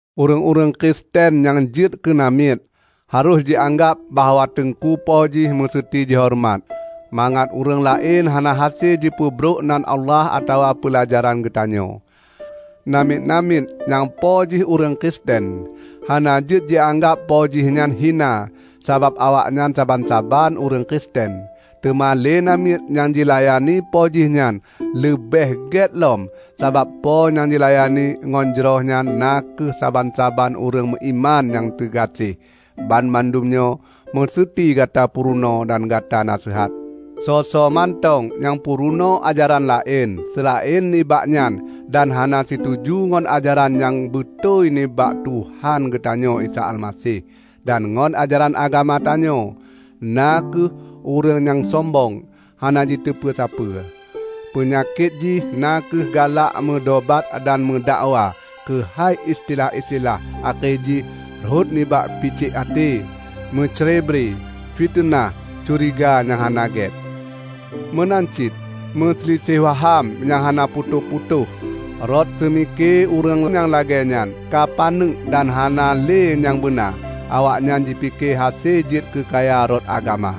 Ureuëng-ureuëng Kristen nyang jeuet keu namiet, harôh jianggab bahwa teungku po jih meuseuti jihoreumat, mangat ureuëng laén hana hase jipeubrok nan Allah atawa peulajaran geutanyoe. Namiet-namiet nyang po jih ureuëng Kristen, hana jeuet jianggab po jih nyan hina sabab awaknyan saban-saban ureuëng Kristen. Teuma lé namiet nyan jilayani po jih nyan leubeh gét lom, sabab po nyang jilayani ngon jroh nyan na kheueh saban-saban ureuëng meuiman nyang teugaséh. Banmandum nyoe meuseuti gata peurunoe dan gata naseuhat. Soe-soe mantong nyang peurunoe ajaran laén seulaén nibak nyan dan hana situju ngon ajaran nyang beutôi nibak Tuhan geutanyoe Isa Almaseh, dan ngon ajaran agama tanyoe, na kheueh ureuëng nyang sombong hana jiteupeue sapeue! Peunyakét jih na kheueh galak meudobat dan meudakwa keuhai istilah-istilah akhé jih rhot nibak picék até, meucrebre, fiteunah, curiga nyang hana gét, meunan cit meusiliseh waham nyang hana putôh-putôh. Rot seumike ureuëng nyang lagée nyan ka paneuk dan hana lé nyang beuna. Awaknyan jipike hase jeuet keukaya rot agama.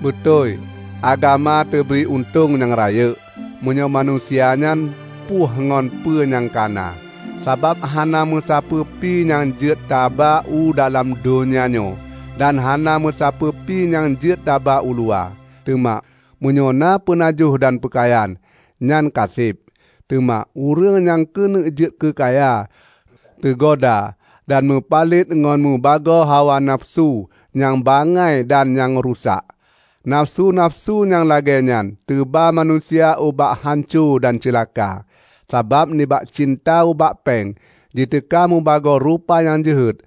Beutôi agama teubri untông nyang rayeuk, meunyoe manusia nyan puih ngon peue nyang ka na. Sabab hana meusapeue pi nyang jeuet taba u dalam donya nyoe, dan hana meusapeue pi nyang jeuet taba uluwa! Teuma, meunyoe na peunajoh dan peukayan, nyan kaseb. Teuma ureuëng nyang keuneuk jeuet keukaya, teugoda dan meupalet ngon mubagoe hawa nafeusu nyang bangai dan nyang rusak. Nafeusu-nafeusu nyang lagée nyan teuba manusia ubak hanco dan ceulaka. Sabab nibak cinta ubak péng, jiteuka mubagoe rupa nyang jeuhet.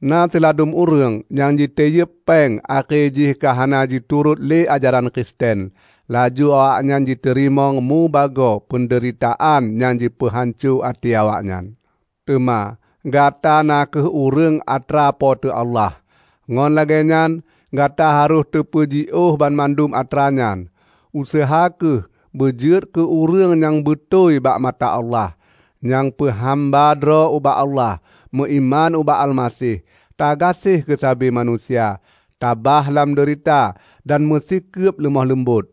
Na siladum ureuëng nyang jitiyeub péng akhé jih ka hana jiturot lé ajaran Kristen, laju awaknyan jiteurimong mubagoe peundeuritaan nyang jipeuhanco até awaknyan. Teuma gata na kheueh ureuëng atra Po teu Allah, ngon lagée nyan gata harôh tapeujiôh banmandum atra nyan. Useuha kheueh beujeuet keu ureuëng nyang beutôi bak mata Allah, nyang peuhamba droe ubak Allah, meuiman ubak Almaseh, tagaséh keusabe manusia, tabah lam deurita, dan meusikeub leumoh leumbot.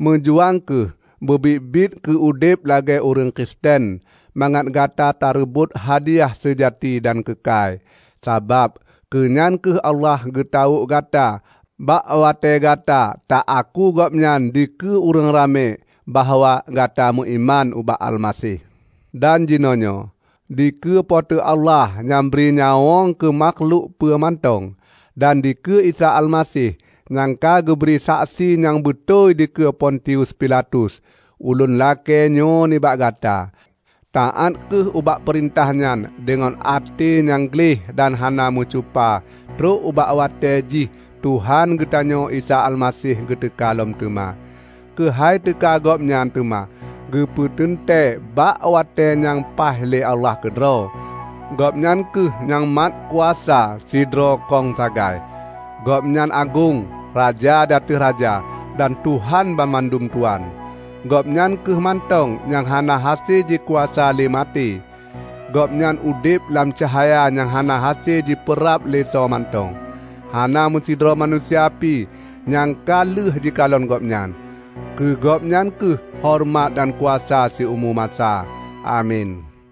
Meujuang kheueh beubiet-biet keu udeb lagée ureuëng Kristen mangat gata tareubot hadiyah seujati dan keukai. Sabab keunyan kheueh Allah geutawök gata bak watée gata ta-aku Gobnyan dikeue ureuëng ramé bahwa gata meuiman ubak Almaseh. Dan jinoenyoe, dikeue Po teu Allah nyang bri nyawöng keu makhlok peue mantong, dan dikeue Isa Almaseh nyang ka geubri saksi nyang beutôi dikeue Pontius Pilatus, ulôn lakée nyoe nibak gata: Taát kheueh ubak peurintah nyan deungon até nyang gleh dan hana meucupa trok ubak watée jih Tuhan geutanyoe Isa Almaseh geuteuka lom teuma. Keuhai teuka Gobnyan teuma geupeuteuntée bak watée nyang paih lé Allah keudroe. Gobnyan kheueh nyang matkuasa sidroe kong sagai; Gobnyan agong, Raja di ateueh raja, dan Tuhan banmandum tuan. Gobnyan kheueh mantong nyang hana hase jikuasa lé maté; Gobnyan udeb lam cahya nyang hana hase jipeurab lé soemantong. Hana meusidroe manusia pi nyang ka lheueh jikalon Gobnyan. Keu Gobnyan kheueh horeumat dan kuasa siumu masa! Amin.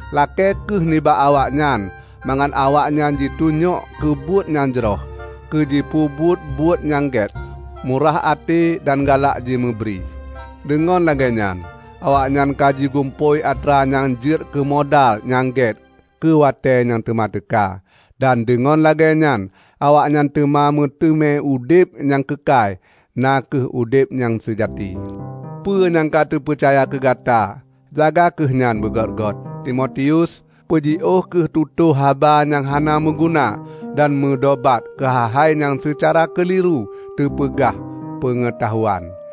Lakée kheueh nibak awaknyan mangat awaknyan jitunyok keubuet nyang jroh, keu jipeubuet buet-buet nyang gét, murah até dan galak jimeubri. Deungon lagée nyan awaknyan ka jigumpôi atra nyang jeuet keumodal nyang gét keuwatée nyang teuma teuka. Dan deungon lagée nyan awaknyan teuma meuteumé udeb nyang keukai, na kheueh udeb nyang seujati. Peue nyang ka teupeucaya keugata, jaga kheueh nyan beugôt-gôt, Timotius! Peujiôh kheueh tutoe haba nyang hana meuguna dan meudobat keuhai-hai nyang seucara keuliru teupeugah "Peungeutahuan".